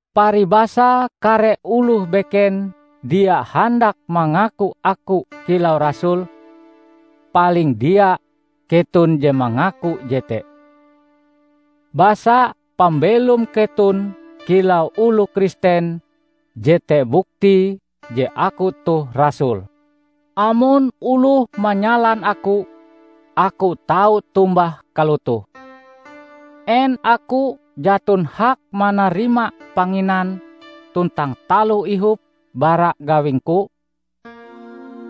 Paribasa kare oloh beken dia handak mangaku aku kilau rasul, paling dia, keton je mangaku jete! Basa pambelom keton kilau oloh Kristen jete buktie je aku toh rasul. Amon oloh manyalan aku, aku tau tombah kalotoh: En aku jaton hak manarima panginan tuntang taloh ihop bara gawingku?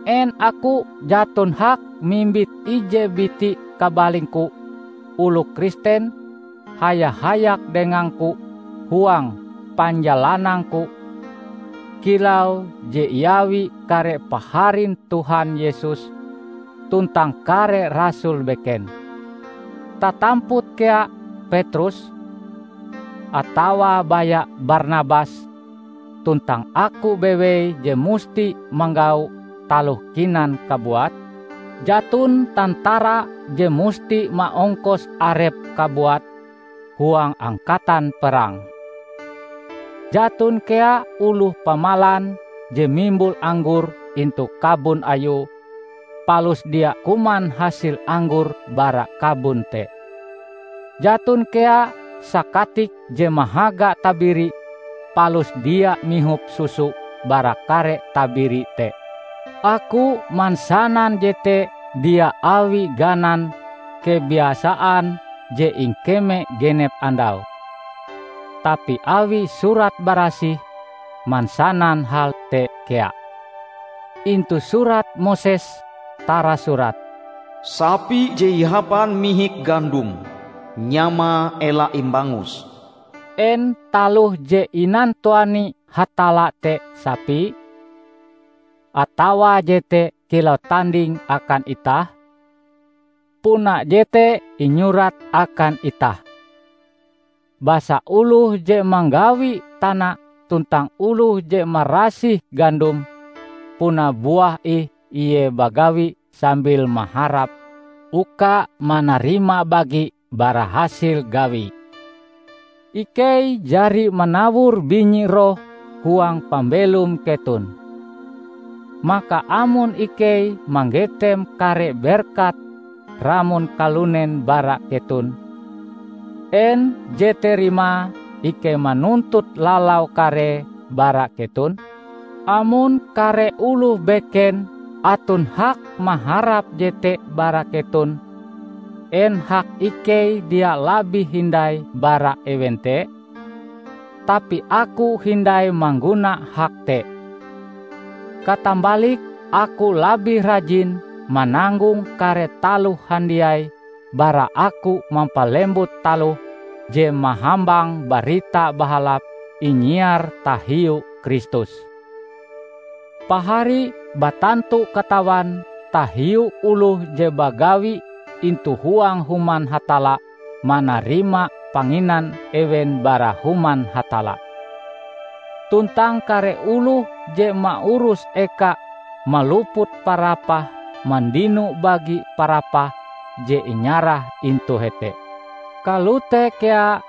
En aku jaton hak mimbit ije biti kabalingku oloh Kristen haya-hayak dengangku huang panjalanangku, kilau je iawi kare paharin Tuhan Yesus tuntang kare rasul beken, tatamput kea Petrus? Atawa baya Barnabas tuntang aku bewei je musti manggau taloh kinan kabuat? Jaton tantara je musti maongkos arepe kabuat huang angkatan perang! Jaton kea oloh pamalan je mimbul anggor intu kabon ayue palus dia kuman hasil anggor bara kabon te! Jaton kea sakatik je mahaga tabiri palus dia mihop susu bara kare tabiri te! Aku mansanan jete dia awi ganan kebiasaan je ingkeme genep andau, tapi awi Surat Barasih mansanan hal te kea. Intu Surat Moses tarasurat, "Sapi je ihapan mihik gandom, nyamae ela imbangus." En taloh je inantuani Hatalla te sapi? Atawa jete kilau tanding akan itah? Puna jete inyurat akan itah. Basa oloh je manggawi tana tuntang oloh je marasih gandome puna buah ih ie bagawi sambil maharap uka manarima bagi bara hasil gawie. Ikei jari manawor binyi roh huang pambelom keton. Maka amon ikei manggetem kare berkat ramon kalunen bara keton, en jete rimae ikei manuntut lalau karee bara keton? Amon kare oloh beken aton hak maharap jete bara keton, en hak ikei dia labih hindai bara ewen te? Tapi aku hindai mangguna hak te. Katambalike aku labih rajin mananggong kare taloh handiai bara aku mampalembut taloh je mahambang Barita Bahalap inyiar tahiu Kristus. Pahari batantu katawan tahiu oloh je bagawi intu huang Human Hatalla manarima panginan ewen bara Human Hatalla. Tuntang kare oloh je maurus eka maluput parapah mandino bagi parapah je inyarah intu hete. Kalote kea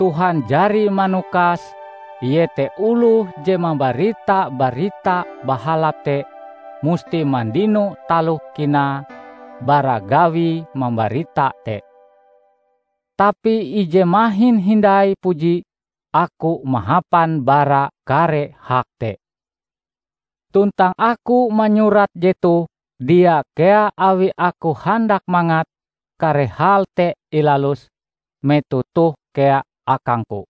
Tuhan jari manukas iete oloh je mambarita Barita Bahalap te musti mandino taloh kinae bara gawie mambarita te. Tapi ije mahin hindai puji aku mahapan bara kare hak te. Tuntang aku manyurat jetoh dia kea awi aku handak mangat kare hal te ilalus metoh toh kea akangku.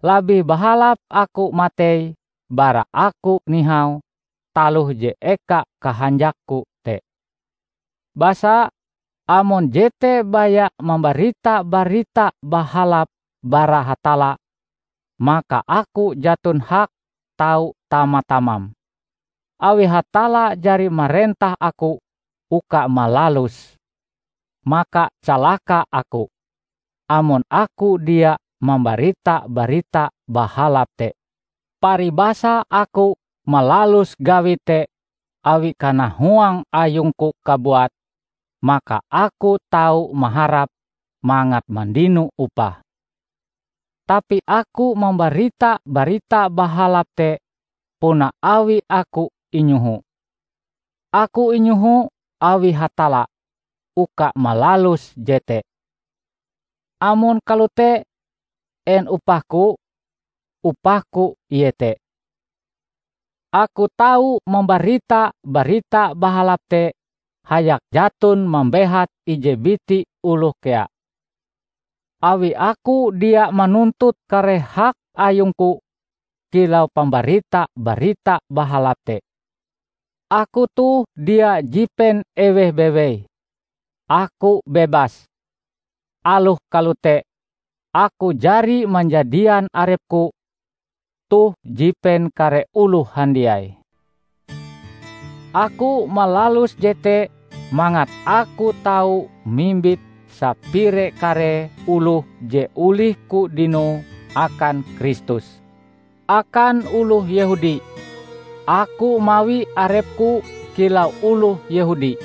Labih bahalap aku matei bara aku nihau taloh je eka kahanjakku te. Basa, amon jete baya mambarita Barita Bahalap bara Hatalla, maka aku jaton hak tau tama-tamam, awi Hatalla jari marentah aku uka malaluse. Maka calaka aku, amon aku dia mambarita Barita Bahalap te! Paribasa aku malalus gawi te awi kanahuang ayungku kabuat, maka aku tau maharap mangat mandino upah. Tapi aku mambarita Barita Bahalap te puna awi aku inyoho. Aku inyoho awi Hatalla uka malalus jete. Amon kalote, en upahku? Upahku iete: aku tau mambarita Barita Bahalap te hayak jaton mambehat ije biti oloh kea, awi aku dia manuntut kare hak ayungku kilau pambarita Barita Bahalap te. Aku toh dia jipen eweh bewei; aku bebas. Aloh kalote, aku jari manjadian arepku toh jipen kare oloh handiai. Aku malalus jete mangat aku tau mimbit sapire karee oloh je olihku dinoe akan Kristus. Akan oloh Yehudi, aku mawi arepku kilau oloh Yehudi,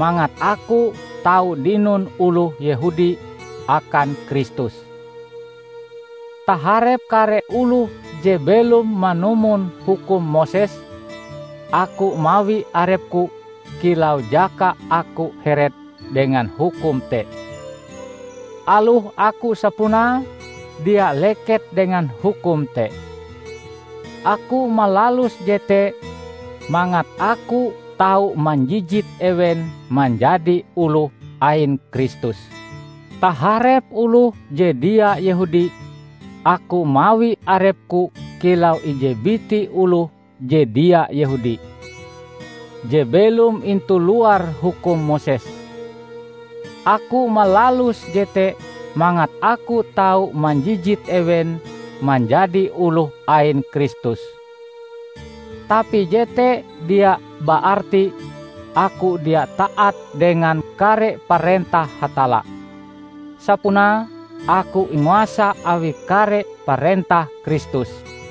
mangat aku tau dinon oloh Yehudi akan Kristus. Taharep kare oloh je belom manumon hukum Moses, aku mawi arepku kilau jaka aku heret dengan hukum te, aloh aku sapunae dia leket dengan hukum te. Aku malalus jete mangat aku tau manjijit ewen manjadi oloh ain Kristus. Taharep oloh je dia Yehudi, aku mawi arepku kilau ije biti oloh je dia Yehudi, je belom intu luar hukum Moses. Aku malalus jete mangat aku tau manjijit ewen manjadi oloh ain Kristus. Tapi jete dia baarti aku dia taat dengan kare parentah Hatalla; sapunae aku inguasa awi kare parentah Kristus.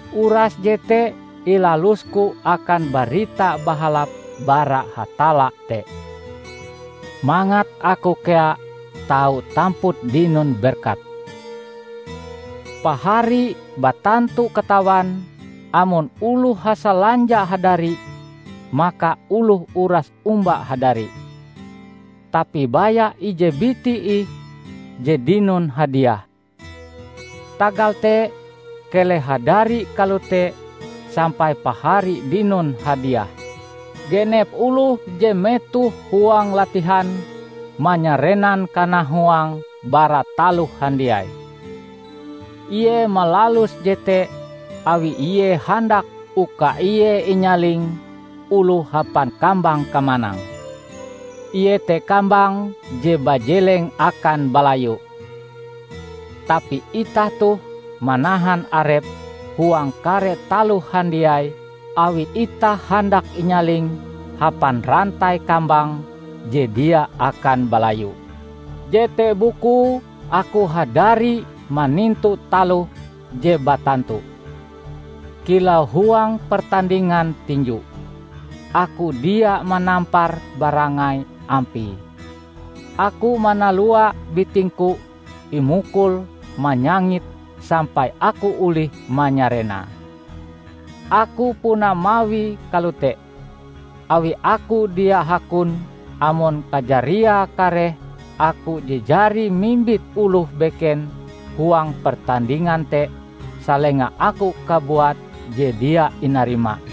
Uras jete ilalusku akan Barita Bahalap bara Hatalla te, mangat aku kea tau tamput dinon berkat. Pahari batantu katawan amon oloh hasalanja hadari maka oloh uras omba hadari, tapi baya ije biti ih je dinon hadiah. Tagal te keleh hadari kalote sampai pahari dinon hadiah. Genep oloh je metoh huang latihan, manyarenan kanahuange bara taloh handiai. Ie malalus jete awi ie handak uka ie inyaling oloh hapan kambang kamanang, iete kambang je bajeleng akan balayu. Tapi itah toh manahan arep huang kare taloh handiai awi itah handak inyaling hapan rantai kambang je dia akan balayu. Jete bukue aku hadari manintu taloh je batantu. Kilau huang pertandingan tinju, aku dia manampar barangai ampie. Aku manalua bitingku imukul manyangit sampai aku olih manyarenae. Aku puna mawie kalote, awi aku dia hakon amon kajariae kareh aku je jari mimbit oloh beken huang pertandingan te, salenga aku kabuat je dia inarima.